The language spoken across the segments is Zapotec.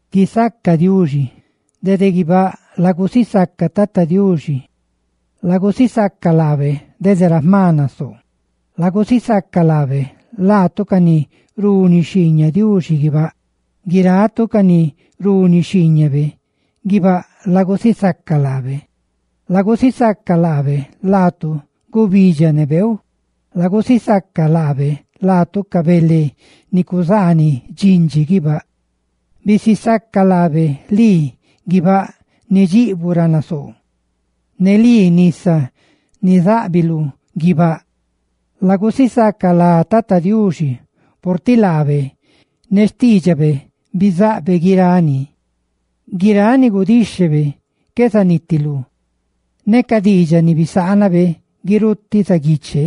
¡Guisaca Diuxi! ¡Dede guibáꞌ lagusisaca Tata Diuxi! ¡Lagusisaca laabe dede ra jma nasoo! ¡Lagusisaca laabe, laatu ca ni runi xhiiñaꞌ Diuxi guibáꞌ! ¡Guiratu ca ni runi xhiiñabe guibáꞌ, lagusisaca laabe! ¡Lagusisaca laabe laatu, gubidxa ne beeu! ¡Lagusisaca laabe laatu, ca bele ni cuzaaniꞌ dxindxi guibáꞌ! ¡Bisisaca laabe lii, guibáꞌ ni jma nasoo, ne lii, nisa ni záꞌbiluꞌ guibáꞌ! Lagusisaca lá Tata Diuxi, purtiꞌ laabe ne xtiidxabe bizaꞌbe guirani; guiráꞌ ni gudíxhebe qué zanitilú, ne ca diidxaꞌ biaꞌ ni bisaanabe guirutiꞌ zaguiche.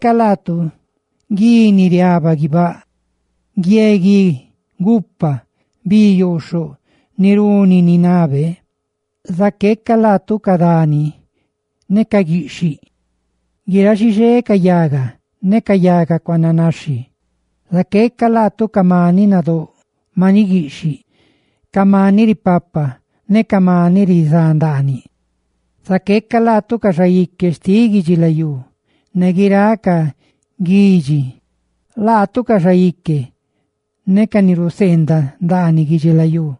¡Laatu gui ni riaba guibáꞌ, guie gui ne gupa! ¡Bi yooxhoꞌ ni runi ni nabe! ¡Ca dani ne ca guiꞌxhiꞌ! ¡Guiráꞌ xixé ca yaga cedru ne ca yaga cuananaxhi! ¡Ca maniꞌ nadóꞌ ne ca maniꞌ guiꞌxhiꞌ! ¡Ca maniꞌ ripapa ne ca maniꞌ rizá ndaaniꞌ! ¡Ca xaique xtiꞌ guidxilayú ne guiráꞌ ca guidxi! ¡Ca xaique ne ca ni raca ni ná ndaaniꞌ guidxilayú!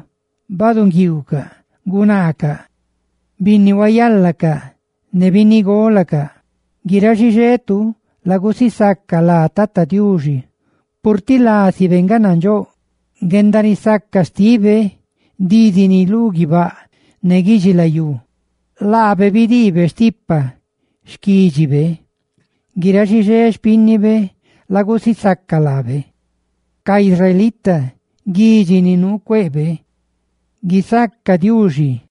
¡Nguiiu ne gunaa, binnihuayala ne binnigola! ¡Guiráꞌ xixetu lagusisaca lá Tata Diuxi, purtiꞌ lásibe nga nandxóꞌ! ¡Guendarisaca xtibe dídini lú guibáꞌ ne guidxilayú! ¡Laabe bidiibe stipa xquídxibe! ¡Guiráꞌ xixé xpínnibe lagusisaca laabe, ca israelita, xquídxibe ni nuu cueꞌbe! ¡Guisaca Diuxi!